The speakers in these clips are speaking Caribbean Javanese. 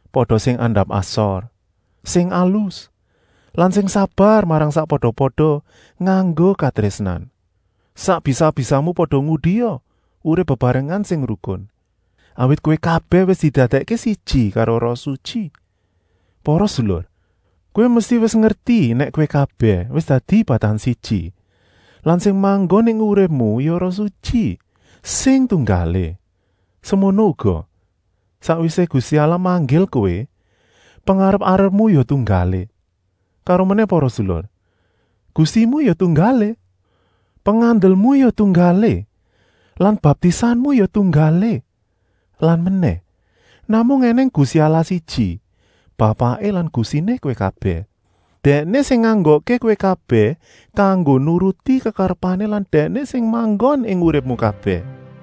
Pada sing andap-asor, sing alus lan sing sabar marang sakpada-pada nganggo katrésnan. Sak bisa-bisamu pada ngudia urip bebarengan sing rukun, awit kowé kabèh wis didadèkké siji karo Roh Sutyi. Para sedulur, kowé mesti wis ngerti nèk kowé kabèh wis dadi badan siji lan sing manggon ing uripmu ya Roh Sutyi sing tunggalé. Semono uga, sakwisé Gusti Allah manggil kowé, pengarep-arepmu ya tunggalé. Karomenèh para sedulur, Gustimu ya tunggalé, pengandelmu ya tunggalé lan baptisanmu ya tunggalé. Lan menèh, namung ènèng Gusti Allah siji, Bapaké lan Gustiné kowé kabèh. Dèkné sing nganggokké kowé kabèh kanggo nuruti kekarepané lan Dèkné sing manggon ing uripmu kabèh.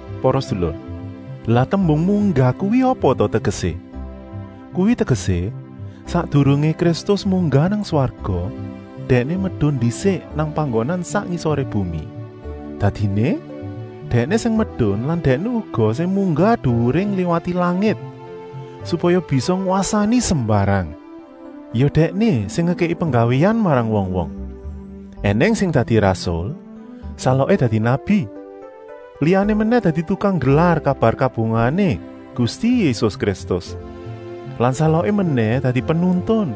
Para sedulur, lah tembung “munggah” kuwi apa ta tegesé? Kuwi tegesé: sakdurungé Kristus munggah nang swarga, Dèkné medun ndisik nang panggonan sak ngisoré bumi. Dadiné, Dèkné sing medun lan Dèkné uga sing munggah duwuré ngliwati langit, supaya bisa ngwasani sembarang. Ya Dèkné sing ngekèki penggawéan marang wong-wong: ènèng sing dadi rasul, saloké dadi nabi, liyané menèh dadi tukang nggelar kabar kabungahané Gusti Yésus Kristus lan saloké menèh dadi penuntun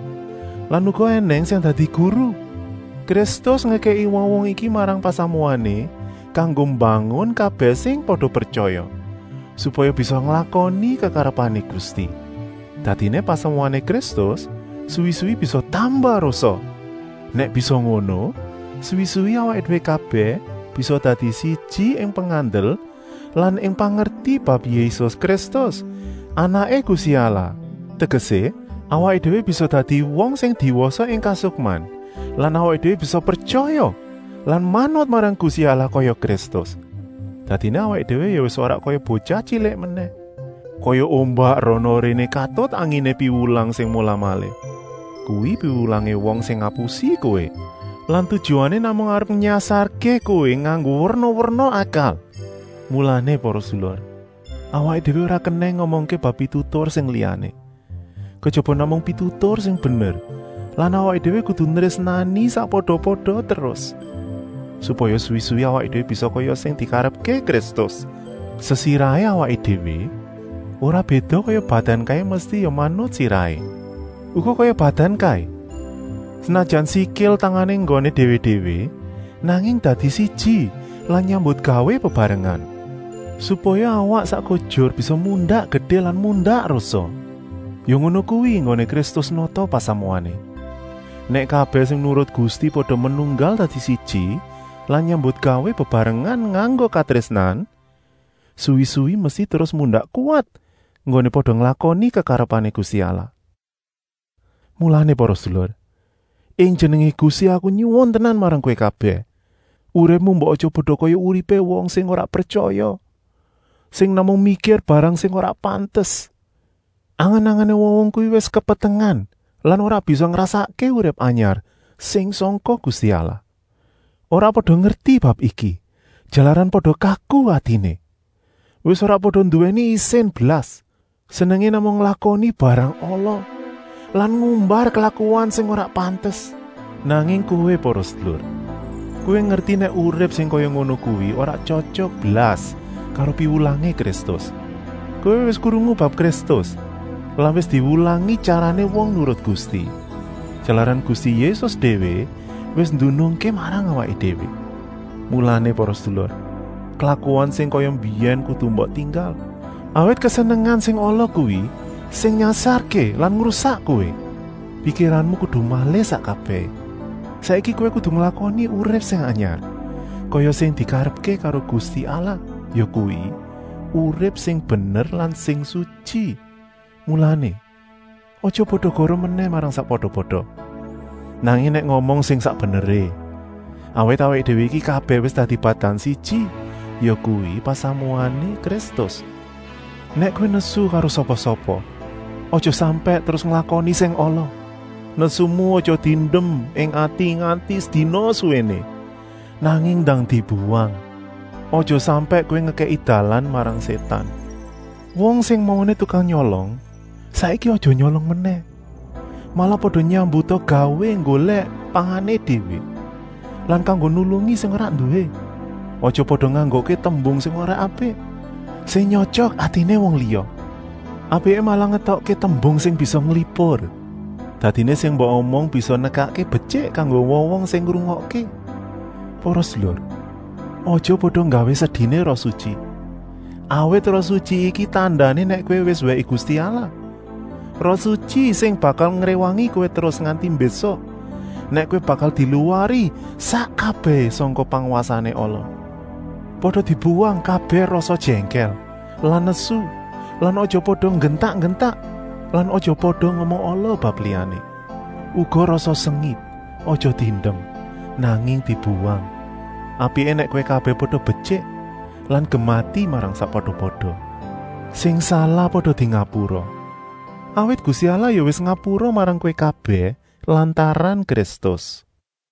lan uga ènèng sing dadi guru. Kristus ngekèki wong-wong iki marang pasamuané kanggo mbangun kabèh sing pada pretyaya, supaya bisa nglakoni kekarepané Gusti. Dadiné pasamuané Kristus suwi-suwi bisa tambah rosa. Nèk bisa ngono, suwi-suwi awaké déwé kabèh bisa dadi siji ing pengandel lan ing pangerti bab Yésus Kristus, Anaké Gusti Allah, tegesé, awaké déwé bisa dadi wong sing diwasa ing kasukman lan awaké déwé bisa pretyaya lan manut marang Gusti Allah kaya Kristus. Dadiné awaké déwé ya wis ora kaya botyah tyilik menèh, kaya ombak rana-réné katut anginé piwulang sing molah-malih. Kuwi piwulangé wong sing ngapusi kowé lan tujuané namung arep nyasarké kowé nganggo werna-werna akal. Mulané para sedulur, awaké déwé ora kenèng ngomongké bab pitutur sing liyané, kejaba namung pitutur sing bener lan awaké déwé kudu nrésnani sakpada-pada terus, supaya suwi-suwi awaké déwé bisa kaya sing dikarepké Kristus, sesirahé awaké déwé, ora béda kaya badan kaé mesti ya manut sirahé. Uga kaya badan kaé, senajan sikil-tangané nggoné déwé-déwé, nanging dadi siji lan nyambutgawé bebarengan, supaya awak sak kujur bisa mundak gedé lan mundak rosa. Ya ngono kuwi enggoné Kristus nata pasamuané. Nèk kabèh sing nurut Gusti pada menunggal dadi siji lan nyambutgawé bebarengan nganggo katrésnan, suwi-suwi mesti terus mundak kuwat enggoné pada nglakoni kekarepané Gusti Allah. Mulané para sedulur, ing jenengé Gusti aku nyuwun tenan marang kowé kabèh: uripmu mbok aja pada kaya uripé wong sing ora pretyaya, sing namung mikir barang sing ora pantes. Angen-angené wong-wong kuwi wis kepetengen lan ora bisa ngrasakké urip anyar sing sangka Gusti Allah. Ora pada ngerti bab iki, jalaran pada kaku atiné. Wis ora pada nduwèni isin blas. Senengé namung nglakoni barang ala lan ngumbar klakuan sing ora pantes. Nanging kowé para sedulur, kowé ngerti nèk urip sing kaya ngono kuwi ora tyotyok blas karo piwulangé Kristus. Kowé wis krungu bab Kristus lan wis diwulangi tyarané wong nurut Gusti, jalaran Gusti Yésus déwé wis nduduhké marang awaké déwé. Mulané para sedulur, klakuan sing kaya mbiyèn kudu mbok tinggal, awit kesenengan sing ala kuwi sing nyasarké lan ngrusak kowé. Pikiranmu kudu malih sak kabèhé. Saiki kowé kudu nglakoni urip sing anyar, kaya sing dikarepké karo Gusti Allah, yakuwi, urip sing bener lan sing sutyi. Mulané, aja pada goroh menèh marang sakpada-pada, nanging nèk ngomong sing sak beneré, awit awaké déwé iki kabèh wis dadi badan siji, yakuwi pasamuané Kristus. Nèk kowé nesu karo sapa-sapa, aja sampèk terus nglakoni sing ala. Nesumu aja diendem ing ati nganti sedina suwéné, nanging ndang dibuwang. Aja sampèk kowé ngekèki dalan marang Sétan. Wong sing mauné tukang nyolong, saiki aja nyolong menèh, malah pada nyambuta gawé nggolèk pangané déwé lan kanggo nulungi sing ora nduwé. Aja pada nganggokké tembung sing ora apik, sing nyotyok atiné wong liya. Apiké malah ngetokké tembung sing bisa nglipur. Dadiné sing mbok omong bisa nekakké betyik kanggo wong-wong sing ngrungokké. Para sedulur, aja pada nggawé sediné Roh Sutyi, awit Roh Sutyi iki tandané nèk kowé wis wèké Gusti Allah, Roh Sutyi sing bakal ngréwangi kowé terus nganti mbésuk, nèk kowé bakal diluwari sak kabèhé sangka pangwasané ala. Pada dibuwang kabèh rasa jèngkèl lan nesu lan aja pada nggentak-nggentak lan aja pada ngomong ala bab liyané. Uga rasa sengit, aja diendem, nanging dibuwang. Apiké nèk kowé kabèh pada betyik lan gemati marang sakpada-pada. Sing salah pada dingapura, awit Gusti Allah ya wis ngapura marang kowé kabèh lantaran Kristus.